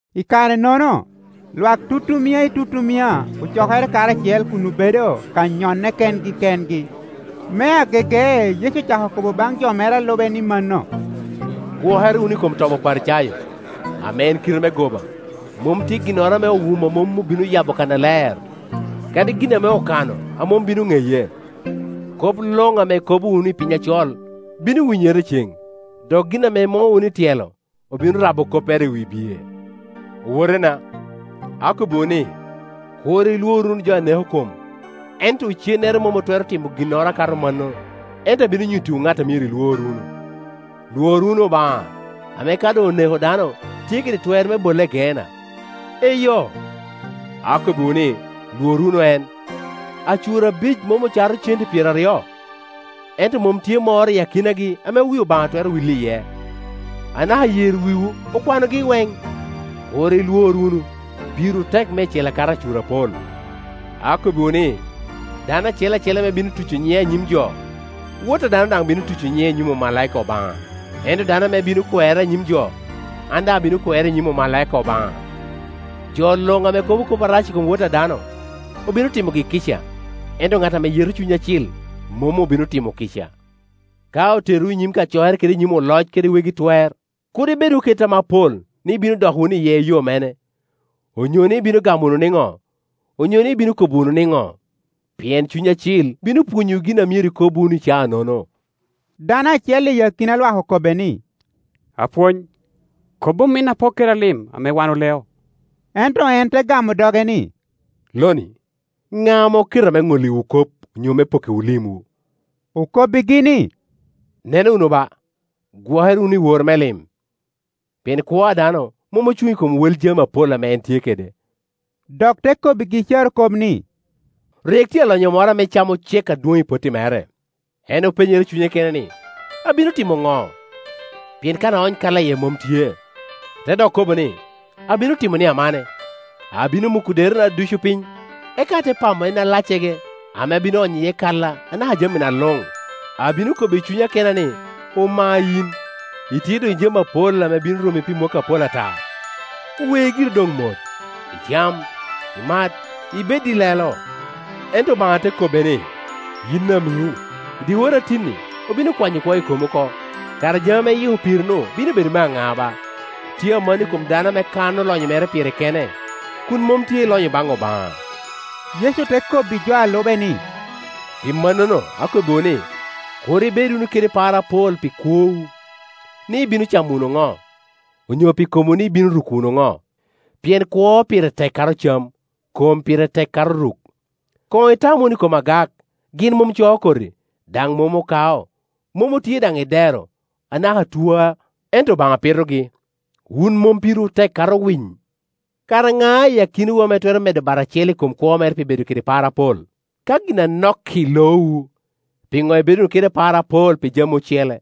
I kare-nono, lwak tutumia i tutumia ocokere karacel, kun obedo ka nyonne kengi kengi. Me agege Yecu ocako kobo baŋ jo mere a lube ni mano, “Gwokere wunu i kom tobi Oparicayo, ame en kite me goba. Mom tye ginnoro ame owumo a mom obino yabo kannaler, kadi gin ame okano a mom bino ŋeye. Kop luŋ ame ikobo wunu i piny acol, bino winyere i ceŋ, dok gin ame imuŋo wunu i tyelo, obino rabo koppere i wi bye. “Owotena akobbiwu ni, kur ilwor wunu jo a neko kom, ento icennere mom otwero timo ginnoro akato mano. Ento abino nyuttiwu ŋat a myero ilwor wunu: lwor wunu Obaŋa, ame ka doŋ oneko dano, tye kede twer me bole i Geenna. Eyo, akobbiwu ni, lwor wunu en! Acur abic mom ocato cente pyeraryo? Ento mom tye moro i akinagi ame wi Obaŋa twero wil iye. Anaka yer wiwu okwanogi iweŋ. Kur i lwor wunu; pirwu tek meicel akato acur apol. “Akobbiwu ni, dano acel acel ame bino tuco nyiŋa i nyim jo, Wot a dano daŋ bino tuco nyiŋe i nyim omalaika Obaŋa; ento dano ame bino kwera i nyim jo, an daŋ abino kwere i nyim omalaika Obaŋa. Jo luŋ ame kobo kop arac i kom Wot a dano, obino timogi kica; ento ŋat ame yeto Cuny Acil mom obino limo kica. Ka oterowu i nyim kacokere kede i nyim oloc kede wegi twer, kur ibed wunu kede tam apol ni ibino dok wunu iye i yo mene, onyo ni ibino gamo wunu niŋo, onyo ni ibino kobo wunu niŋo? Pien Cuny Acil bino pwonyowu gin a myero ikob wunu i caa-nono.” Dano acel i akina lwak okobbe ni, “Apwony, kob ominna pok keda lim ame wan oleo.” Ento en te gamo doge ni, “Lo-ni, ŋa ame oketa me ŋolliwu kop onyo me pokkiwu limwu?” Okobbigi ni, “Neno wunu ba, gwoke re wunu i woro me lim; pien kwo a dano mom ocuŋ i kom wel lim apol ame en tye kede.” Dok te kobbigi carokop ni, “Rik tye alonyo moro ame cam ocek adwoŋ i potti mere. En openyere i cunye kene ni, ‘Abino timo ŋo, pien kan aony kaila iye mom tye?’ Te dok kobo ni, ‘Abino timo ni amane: abino muko derena ducu piny, eka ate pamo en alaccege ame abino onyo iye kaila, anaka jamina luŋ. Abino kobo i cunya kena ni, Omayin, itye doŋ i jami apol ame bino rommi pi mwakki apol ata; we giri doŋ mot, icam, imati, ibedi lelo.’ Ento Obaŋa te kobbe ni, ‘Yin amiŋo! I dyewor a tin-ni obino kwanyo kwo i komi oko; kara jami ame iyiko piri-nu bino bedo me a ŋa ba?’ Tye aman no i kom dano ame kano lonyo pire kene, kun mom tye i lonyo baŋ Obaŋa.” Yecu te kobbi jo a lube ni, “Pi mannono akobbiwu ni, kur ibed wunu kede par apol pi kwowu, ni ibino camo wunu ŋo, onyo pi komwu, ni ibino ruko wunu ŋo? Pien kwo pire tek kato cam, kom pire tek kato ruk. Koŋ itam wunu i kom agak; gin mom coo koti, daŋ mom okao, mom otye daŋ i dero, anaka tuwa, ento Obaŋa pitogi. Wun mom pirwu tek kato winy? Kara ŋa i akinawu ame twero medo bat acel i kom kwo mere pi bedo kede par apol? Ka gin anok-k i loowu, piŋo ibedo wunu kede par apol pi jami ocele?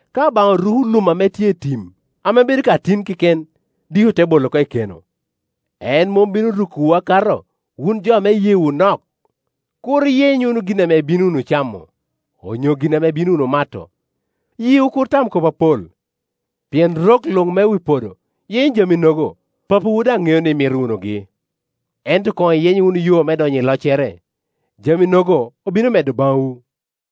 Ka Obaŋa ruko lum a tye i tim, ame bedo ka tin keken, diki ote bolo oko i keno, en mom bino rukowu aka to, wun jo ame iyeewu nok? Kur iyeny wunu gin ame ibino wunu camo, onyo gin ame ibino wunu mato, yiwu kur tam kop apol; pien rok luŋ me wi podo yenyo jami-nogo, Papawu daŋ ŋeo ni imito wunugi. Ento koŋ iyeny wunu yo me donyo i loccere, jami-nogo obino medo baŋwu.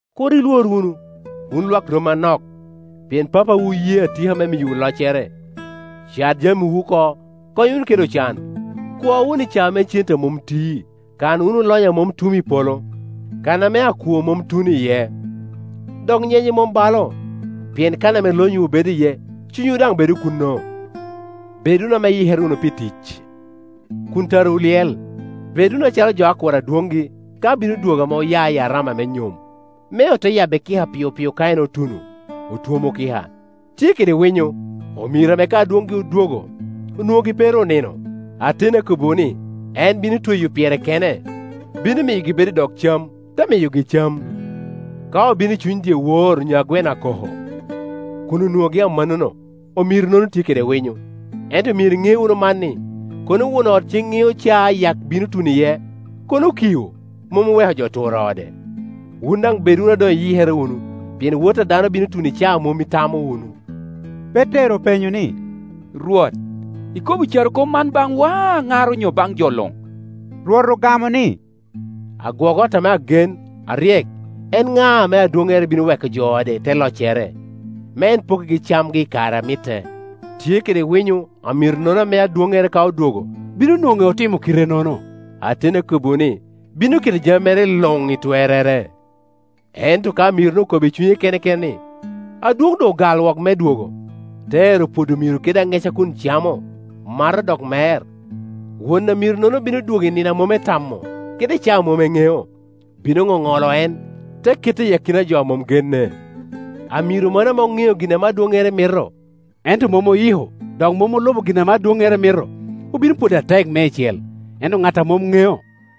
“Kur ilwor wunu, wun lwak rommi anok, pien Papawu oye atika me miyowu loccere. Cat jamiwu oko, kony wunu kede ocan; kwo wunu icao me cente a mom ti, kan wunu lonyo a mom tum i polo, kan ame akwo mom tuno iye, dok nyenye mom balo. Pien kan ame lonyowu bedo iye, cunywu daŋ bedo kuno. “Bed wunu ame iyikere wunu pi tic, kun tarawu lyel. Bed wunu acalo jo a kuro adwoŋgi ka bino dwogo ame oya i arama me nyom, me ote yabbe kika piopio ka en otuno, otwomo kika. Tye kede winyo omiro ame ka adwoŋgi odwogo, onwoŋogi pe ru onino. Ateni akobbiwu ni, en bino tweyo pyere kene, bino miyogi bedo i dog cam, te miyogi cam. Ka obino i cuny dyewor onyo a gweno akoko, kun onwoŋogi amannono, omiro-nono tye kede winyo. Ento myero iŋe wunu man, ni, kono won ot ceŋ ŋeo caa ame ayak bino tuno iye, kono okio, mom oweko jo oturo ode. Wun daŋ bed wunu a doŋ iyikere wunu, pien Wot a dano bino tuno i caa a mom itamo wunu.” Petero openyo ni, “Rwot, ikobo carokop man baŋwa, aŋar onyo baŋ jo luŋ?” Rwot ogamo ni, “Agwok ot ame agen, aryek, en ŋa, ame adwoŋŋere bino weko jo i ode i te loccere, me en pokkigi camgi i kare a mitte. Tye kede winyo amiro-nono ame adwoŋŋere, ka odwogo, bino nwoŋe otimo kitenono. Ateni akobbiwu ni, bino keto jami mere luŋ i twerrere. Ento ka amiro-nu okobo i cunye kene kene ni, ‘Adwoŋ doŋ ogal wok me dwogo,’ te ero pwodo omiro kede aŋeca, kun camo, mato, dok mer, won amirono no bino dwogo i nino a mom etamo, kede i caa a mom en ŋeo, bino ŋoŋolo en, te kete i akina jo a mom genne. Amiro mano ame oŋeo gin ame adwoŋŋere mito, ento mom oyiko, dok mom olubo gin ame adwoŋŋere mito, obino pwode atek meicel. Ento ŋat a mom ŋeo,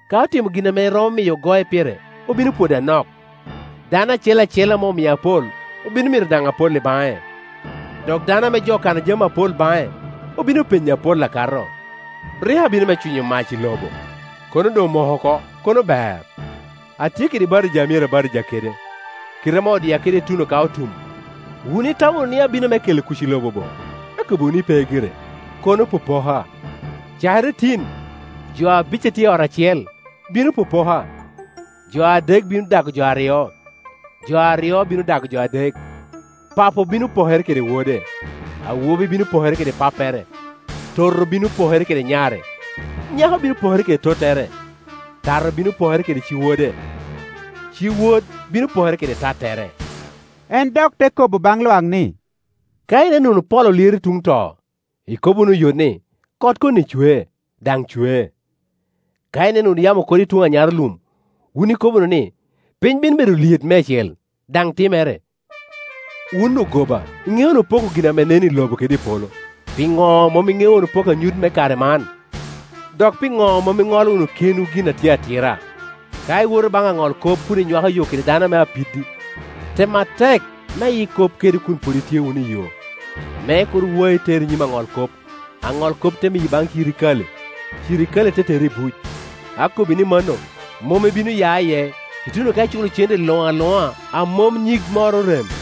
ka otimo gin ame romo miyo ogoe pire, obino pwode anok. Dano acel acel ame omio apol, obino mito daŋ apol i baŋe, dok dano ame jo okano jami apol baŋe, obino penye apol akato. “Rik abino me cwinyo mac i lobo; kono doŋ omoko oko, kono ber! Atye kede batija a myero abatija kede; kite ame odia kede ituno ka otum! Wun itamo wunu ni abino me kelo kuc i lobo bo? Akobbiwu ni, pe gire, kono popoka. Cakere tin, jo abic a tye i ot acel bino popoka; jo adek bino dago jo aryo, jo aryo bino dago jo adek. Papo bino pokere kede wode, awobi bino pokere kede pappere, toto bino pokere kede nyare, nyako bino pokere kede tottere, tato bino pokere kede ci-wode, ci-wod bino pokere kede tattere.” En dok te kobo baŋ lwak ni, “Ka ineno wunu pol olyero tuŋ to, ikobo wunu oyot ni, ‘Kot koni cwe’; daŋ cwe. Ka ineno wunu yamo okodo i tuŋ anyarolum, wun ikobo wunu ni, ‘Piny bino bedo lyet meicel’; daŋ timere. Wun ogoba! Iŋeo wunu poko gin ame nen i lobo kede i polo; piŋo mom iŋeo wunu poko anyut me kare man? “Dok piŋo mom iŋolo wunu kenwu gin a tye atira? Ka iwoto baŋ aŋolkop kun inywako yo kede dano ame apiddi, tem atek me iyik kop kede kun pwod itye wunu iyo, me kur wai, teri i nyim aŋolkop, aŋolkop te miyi baŋ cirikale, cirikale te teri i buc. Akobbi ni mano, mom ibino ya iye ituno ka iculo cente luŋ aluŋa, a mom nyig moro orem.”